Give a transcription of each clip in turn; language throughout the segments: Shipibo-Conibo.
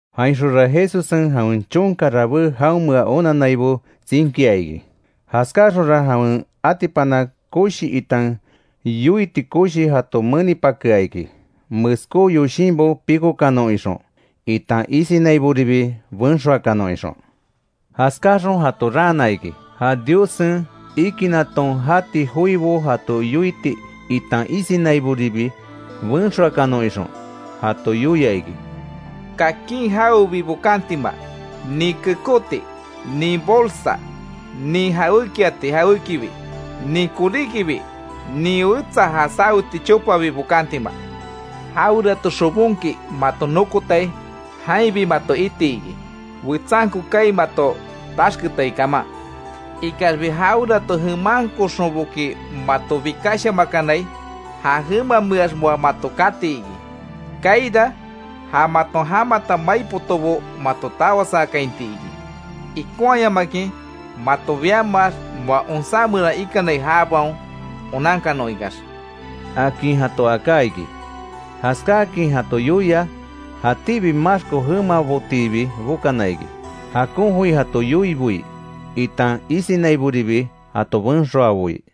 Jainxonra Jesussen jawen chonka rabé jaonmea onannaibo tsinkia iki; jaskáaxonra jawen atipana koshi, itan yoiti koshi jato menipakea iki, meskó yoshinbo pikokanon ixon, itan isinaiboribi benxoakanon ixon. Jaskáaxon jato raana iki, ja Diossen ikinaton jati joibo jato yoiti, itan isinaiboribi benxoakanon ixon. Jato yoia iki: —Kakin jawebi bokantima, nin kekóti, nin bolsa, nin jawékiati jawékibi; nin koríkibi, nin wetsa ja saweti chopabi bokantima. Jawerato xobonki mato nokotai, jainbi mato iti iki, wetsanko kaai mato taxketai kaman. Ikaxbi jawerato jemanxonboki mato bikashamakanai; ja jemameax moa mato kati iki. Kaaira ja maton jamata mai potobo, mato tawasaakainti iki. Ikonhayamakin mato biamax, moa onsá meran ikanai jabaon onankanon ikax —akin jato aká iki. Jaskáakin jato yoia, jatíbi maxko jemabotiibi bokana iki, jakon joi jato yoiboi, itan isinaiboribi jato benxoaboi.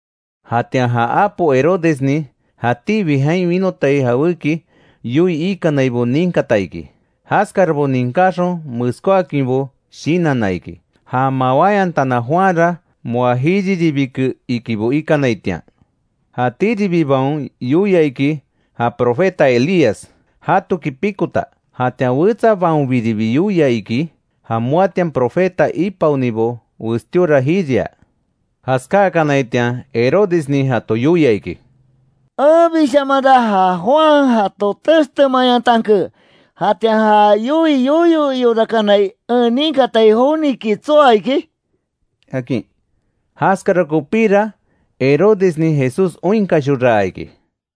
Jatian ja apo Herodesnin jatíbi jain winotai jawéki yoii ikanaibo ninkata iki; jaskarabo ninkáxon meskóakinbo shinanna iki. Ja mawáyantana Juanra moa jiriribike ikibo ikanaitian. Jatíribibaon yoia iki; ja profeta Elías jatoki pikota; jatian wetsabaonbiribi yoia iki, ja moatian profeta ipaonibo westíora jiria. Jaskákanaitian Herodesnin jato yoia iki: —Enbishamanra ja Juan jato textemayantanke ¿Jatian ja yoii yoyo iorakanai, en ninkatai joniki tsoa iki? —akin. Jaskara kopíra Herodesnin Jesús oinkashoraa iki.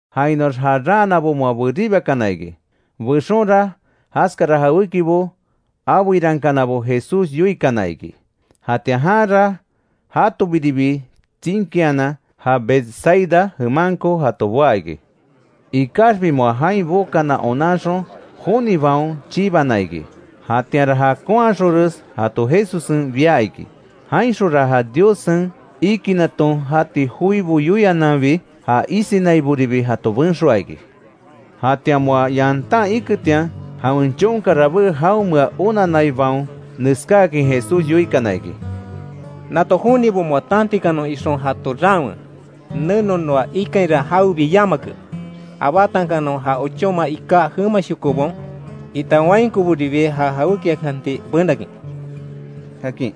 Jainoax ja raanabo moa beribakana iki. Bexonra jaskara jawékibo abeirankanabo Jesús yoikana iki. Jatian janra jatobiribi tsínkianan, ja Betsaida jemanko jato boá iki. Ikaxbi moa jain bokana onanxon jonibaon chibana iki. Jatianra jakonhaxonres jato Jesussen bia iki. Jainxonra ja Diossen ikinaton jati joibo yoiananbi, ja isinaiboribi jato benxoa iki. Jatian moa yantan iketian, jawen chonka rabé jaonmea onanaibaon, neskáakin Jesús yoikana iki: —Nato jonibo moa tantikanon ixon jato raanwe, neno noa ikainra jawebi yamake; abátankanon ja ochóma iká jemashokobaon, itan wainkoboribi ja jawékiakanti benakin —akin.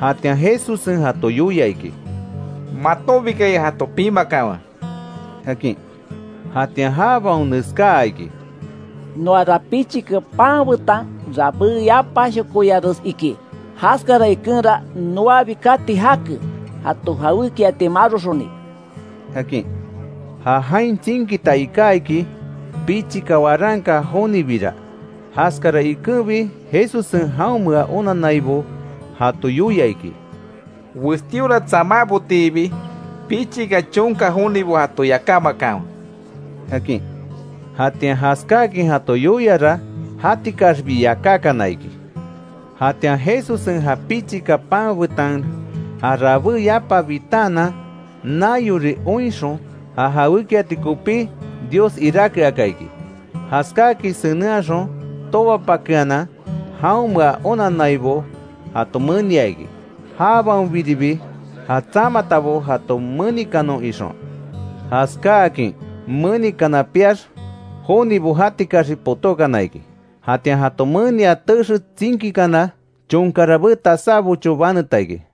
Jatian Jesussen jato yoia iki: —Matonbikaya jato pimakanwe —akin. Jatian jabaon neskaa iki: —Noara pichika pan betan rabé yapashokoyares iki. Jaskara ikenra noabi kati jake, jato jawékiati maroxoni —akin. Ja jain tsinkita iká iki, pichika waranka jonibira; jaskara ikenbi Jesussen jaonmea onannaibo jato yoia iki: —Westíora tsamábotiibi pichika chonka jonibo jato yakámakanwe —akin. Jatian jaskáakin jato yoiara jatikaxbi yakákana iki; Jatian Jesussen ja pichika pan betan ja rabé yapa bitaanan, naiori oinxon, ja jawékiati kopí Dios iráke aka iki. Jaskáakin senenhaxon, tobapakeanan jaonmea onannaibo jato menia iki; jabaonbiribi ja tsamatabo jato menikanon ixon. Jaskáakin menikana piax, jonibo jatikaxbi potókana iki. Jatian jato menia texe tsinkikana, chonka rabé tasá bocho baneta iki.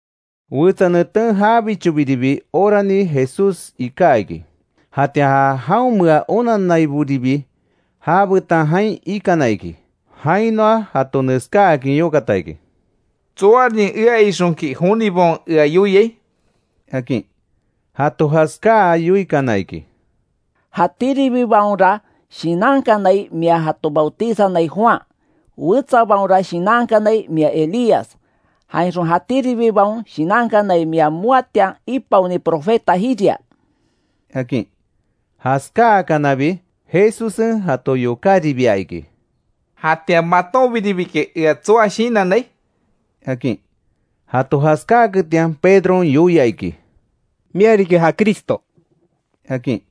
Wetsa neten jabichobiribi orani Jesús iká iki; jatian ja jaonmea onanaiboribi já betan jain ikana iki. Jainoa jato neskáakin yokata iki: —¿Tsoarin ea ixonki jonibaon ea yoiai? —akin. Jato jaskáa yoikana iki: —Jatíribibaonra shinankanai, mia jato bautizanai Juan, wetsabaonra shinankanai mia Elías, jainxon jatíribibaon shinankanai mia moatian ipaoni profeta jiria —akin. Jaskáakanabi Jesussen jato yokáribia iki: —¿Jatian matonbiribiki ea tsoa shinannai? —akin. Jato jaskáaketian Pedron yoia iki: —Mia riki ja Cristo —akin.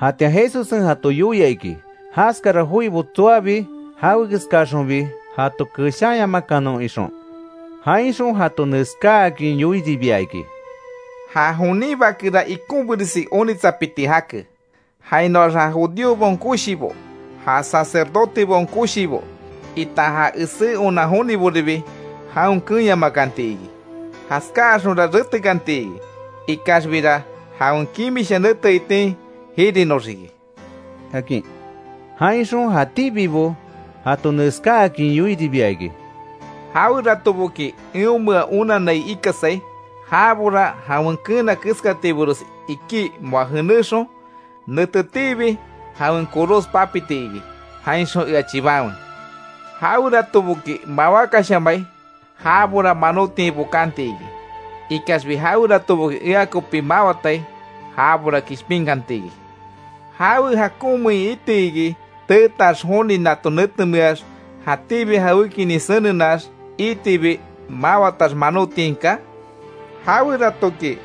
Jatian Jesussen jato yoia iki, jaskara joibo tsoabi jawekeskaxonbi jato keshanyamakanon ixon. Jainxon jato neskáakin yoiribia iki: —Ja jonin Bakera ikonbiresi onitsapiti jake; jainoax ja judíobaon koshibo, ja sacerdotebaon koshibo, itan ja esé onan joniboribi jaon keenyamakanti iki. Jaskáaxonra retekanti iki, ikaxbira jawen kimisha nete itin jirinoxiki —akin. Jainxon jatíbibo jato neskáakin yoiribia iki: —Jaweratoboki eonmea onanai ikasai, jabora jawen keena keskatibores iki moa jenéxon, netetiibi jawen koros papiti iki, jainxon ea chibanwe. Jaweratoboki mawákashamai, jabora manotiain bokanti iki. Ikaxbi jaweratoboki ea kopi mawatai jabora kishpinkanti iki. ¿Jawe jakonmein iti iki, teetax joni nato netemeax jatíbi jawékinin senenax, iitibi mawatax manotiain kaa? Jaweratoki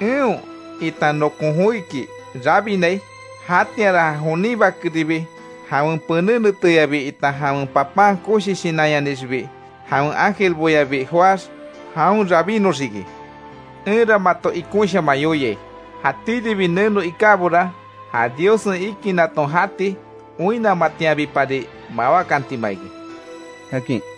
eon itan nokon joiki rabinai; jatianra ja jonin Bakeribi jawen pené neteyabi, itan jawen papan koshi shinanyanixibi jawen ángelboyabi joáx jaon rabinnoxiki. Enra mato ikonshaman yoiai, jatíribi neno ikábora, ja Diossen ikinaton jati oinnamatianbipari mawákantima iki —akin.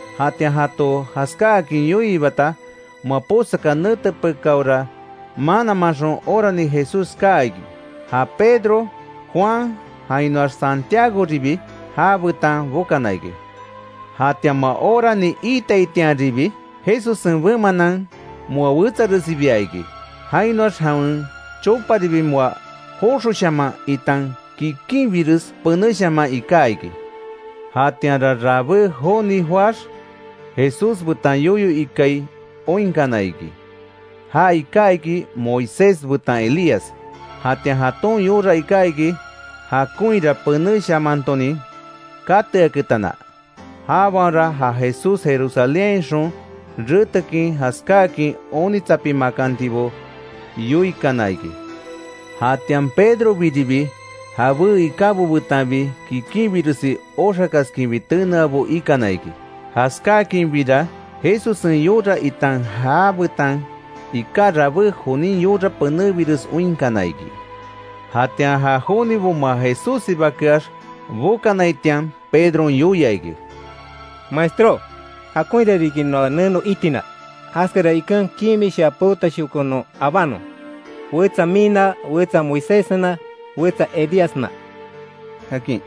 Jatian jato jaskáakin yoiibata, moa posaka nete pekáora mananmanxon orani Jesús kaa iki. Ja Pedro, Juan jainoax Santiagoribi já betan bokana iki. Jatian moa orani iitaitianribi, Jesussen bemanan moa wetsaresibia iki. Jainoax jawen choparibi moa joxoshaman itan kikinbires penéshaman iká iki. Jatianra rabé joni joáx Jesús betan yoyo ikai oinkana iki. Ja iká iki Moisés betan Elías. Jatian jaton yora iká iki jakonhira penéshamantonin kateaketana. Jabaonra ja Jesús Jerusalénhainxon retekin jaskáakin onitsapimakantibo yoikana iki. Jatian Pedrobiribi jabé ikábo betanbi kikinbiresi oxakaskinbi teneabo ikana iki. Jaskáakinbira Jesussen yora itan já betan iká rabé jonin yora penebires oinkana iki. Jatian ja jonibo moa Jesússibakeax bokanaitian Pedron yoia iki: —Maestró, ¡Jakonhira riki noa neno itina! Jaskara iken kimisha peotashoko non abanon: wetsa mina, wetsa Moiséssena, wetsa Elíasna —akin.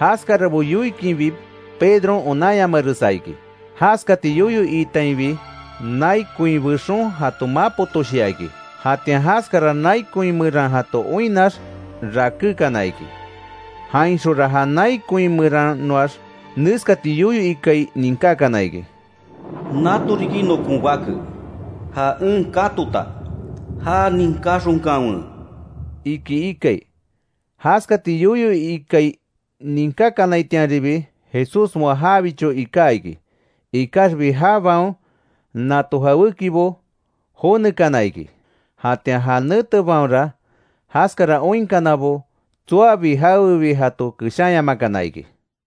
Jaskarabo yoikinbi Pedron onanyamaresa iki. Jaskati yoyo iitainbi, nai koin bexon jato mapotoshia iki. Jatian jaskara nai koin meran jato oinnax rakékana iki. Jainxonra ja nai koin meranoax neskati yoyo ikai ninkákana iki: “Nato riki nokon bake, ja en katota, já ninkáxonkanwe”, iki ikai. Jaskati yoyo ikai ninkákanaitianribi Jesús moa jabicho iká iki; ikaxbi jabaon nato jawékibo jonekana iki. Jatian ja netebaonra jaskara oinkanabo tsoabi jawebi jato keshanyamakana iki.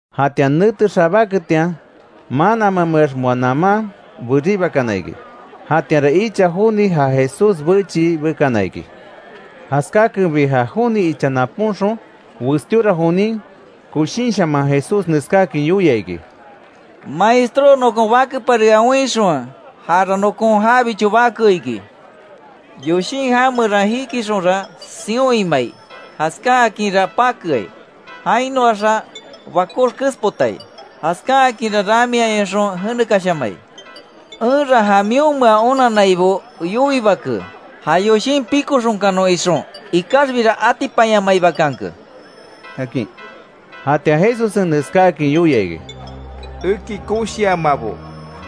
Jatian nete xabáketian mananmameax moa naman beribakana iki. Jatianra icha joni, ja Jesús bechii bekana iki. Jaskákenbi ja joni icha napónxon; westíora jonin koshinshaman Jesús neskáakin yoia iki: —Maestró, nokon bakepari ea oinxonwe, jara nokon jabicho bake iki. Yoshin já meran jikixonra, sion imai jaskáakinra pakeai, jainoaxa bakox kespotai; jaskáakinra ramiayonxon jenekashamai. Enra ja mionmea onannaibo yoiibake, ja yoshin pikoxonkanon ixon; ikaxbira atipanyamaibakanke —akin. Jatian Jesussen neskáakin yoia iki: —¡Eki koshiamabo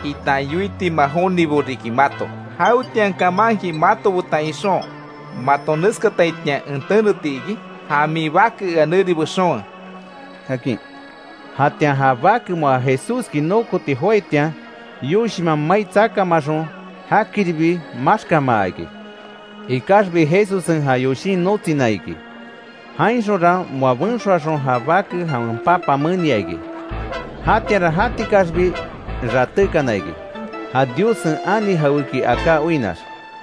itan yoitima jonibo riki mato! ¿Jawetian kamanki mato betan ixon mato neskataitian en teneti iki? Ja min bake ea neri bexonwe —akin. Jatian ja bake moa Jesúski nokoti joaitian, yoshinman mai tsakamaxon jakiribi maxkámaa iki. Ikaxbi Jesussen ja yoshin notsina iki, jainxonra moa benxoaxon, ja bake jawen papa menia iki. Jatianra jatikaxbi ratékana iki, ja Diossen ani jawéki aká oinnax.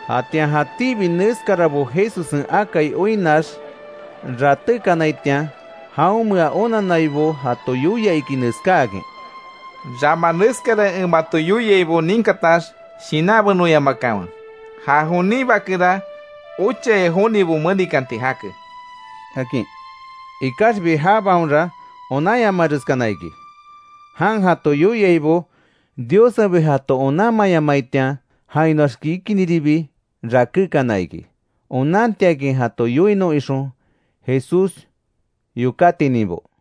Jatian jatíbi neskarabo Jesussen akai oinnax ratékanaitian, jaonmea onannaibo jato yoia iki neskáakin: —Rama neskara en mato yoiaibo ninkatax shinanbenoyamakanwe, ja jonin Bakera, ochaya jonibo menikanti jake —akin. Ikaxbi jabaonra onanyamareskana iki; jan jato yoiaibo; Diossenbi jato onanmayamaitian, jainoax kikiniribi rakékana iki onantiakin jato yoinon ixon Jesús yokátininbo.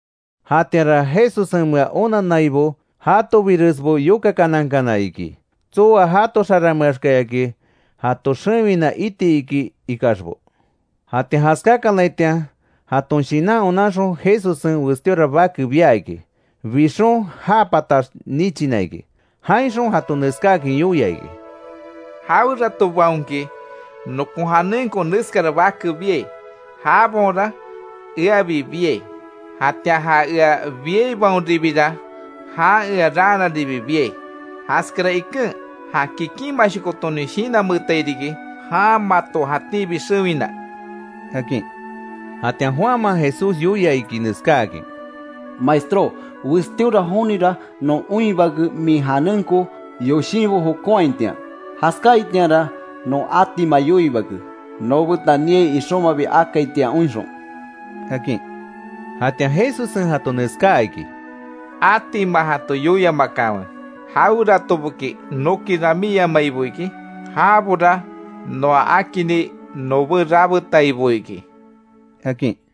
Jatianra Jesussenmea onannaibo jatobiresbo yokakanankana iki, tsoa jato xaranmeakayaki jato xewina iti iki ikaxbo. Jatian jaskákanaitian jaton shinan onanxon, Jesussen westíora bake bia iki; bixon já patax nichina iki. Jainxon jato neskáakin yoia iki: —Jaweratobaonki, nokon janenko neskara bake biai, jabaonra eabi biai. Jatian ja ea biaibaonribira, jan ea raanaribi biai. Jaskara iken ja kikinmanshokotonin shinanmeetai riki, jan mato jatíbi xewina —akin. Jatian Juanman Jesús yoia iki neskáakin: —Maestró, westíora jonira non oinhibake min janenko yoshinbo jokonhaitian. Jaskáaitianra non atima yoiibake, noobetan niai ixonmabi akaitian oinxon —akin. Jatian Jesussen jato neskaa iki: —Atima jato yoiamakanwe; jaweratoboki noki ramíyamaibo iki, jabora noa akini nobé rabetaibo iki —akin.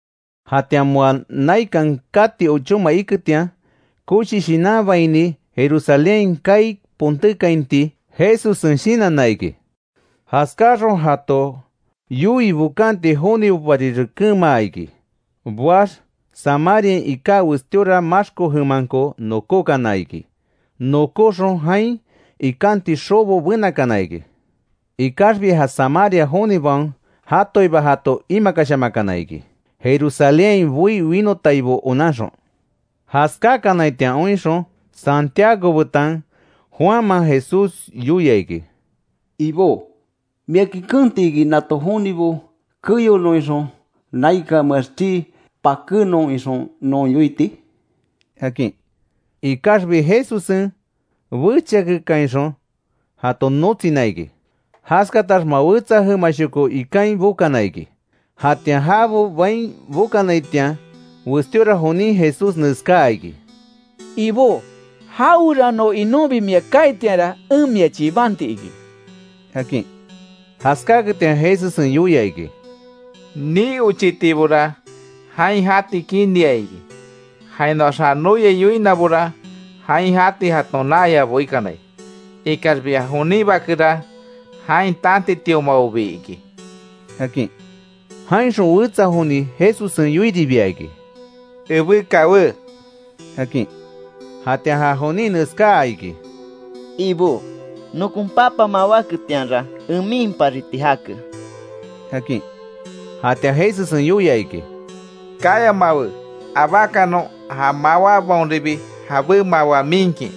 Jatian moa naikan kati ochóma iketian, koshi shinanbaini Jerusalénhain kaai pontékainti Jesussen shinanna iki. Jaskáaxon, jato yoii bokanti jonibopari rekenmaa iki; boax Samariain iká westíora maxko jemanko nokókana iki, nokóxon jain ikanti xobo benakana iki. Ikaxbi ja Samaria jonibaon jatoiba jato imakashamakana iki; Jerusalénhain boí winotaibo onanxon. Jaskákanaitian oinxon, Santiago betan Juanman Jesús yoia iki: —Ibó ¿Miaki keenti iki, nato jonibo keyonon ixon, naikanmeax chii pakénon ixon non yoiti? —akin. Ikaxbi Jesussen bechiakekainxon jato notsina iki. Jaskatax moa wetsa jemashoko ikain bokana iki. Jatian jabo bain bokanaitian, westíora jonin Jesús neskaa iki: —Ibó jawerano inonbi mia kaaitianra, en mia chibanti iki —akin. Jaskáketian Jesussen yoia iki: —Nii ochitibora jain jati kinia iki, jainoax ja noyai yoinabora, jain jati jaton naayabo ikanai; ikaxbi ja jonin Bakera, jain tantitiomabobi iki —akin. Jainxon wetsa joni Jesussen yoiribia iki: —Ebé kawé —akin. Jatian ja jonin neskaa iki: —Ibó, nokon papa mawáketianra en miinpariti jake —akin. Jatian Jesussen yoia iki: —Kayamawe, abákanon ja mawábaonribi jabé mawa miinkin;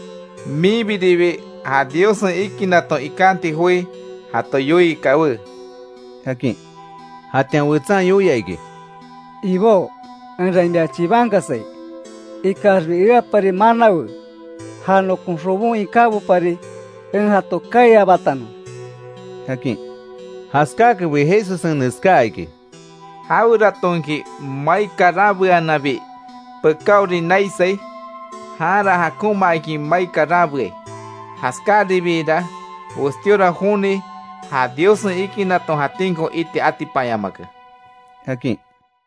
minbiribi ja Diossen ikinaton ikanti joi jato yoii kawé —akin. Jatian wetsan yoia iki: —Ibó enra mia chibankasai, ikaxbi eapari manawe; ja nokon xobon ikábopari en jato kaai abátanon —akin. Jaskáakenbi Jesussen neskáa iki: —Jaweratonki mai karanbeananbi pekáori naisai, janra jakonmaakin mai karanbeai. Jaskaribiira westíora joni ja Diossen ikinaton jatínko iti atipanyamake —akin.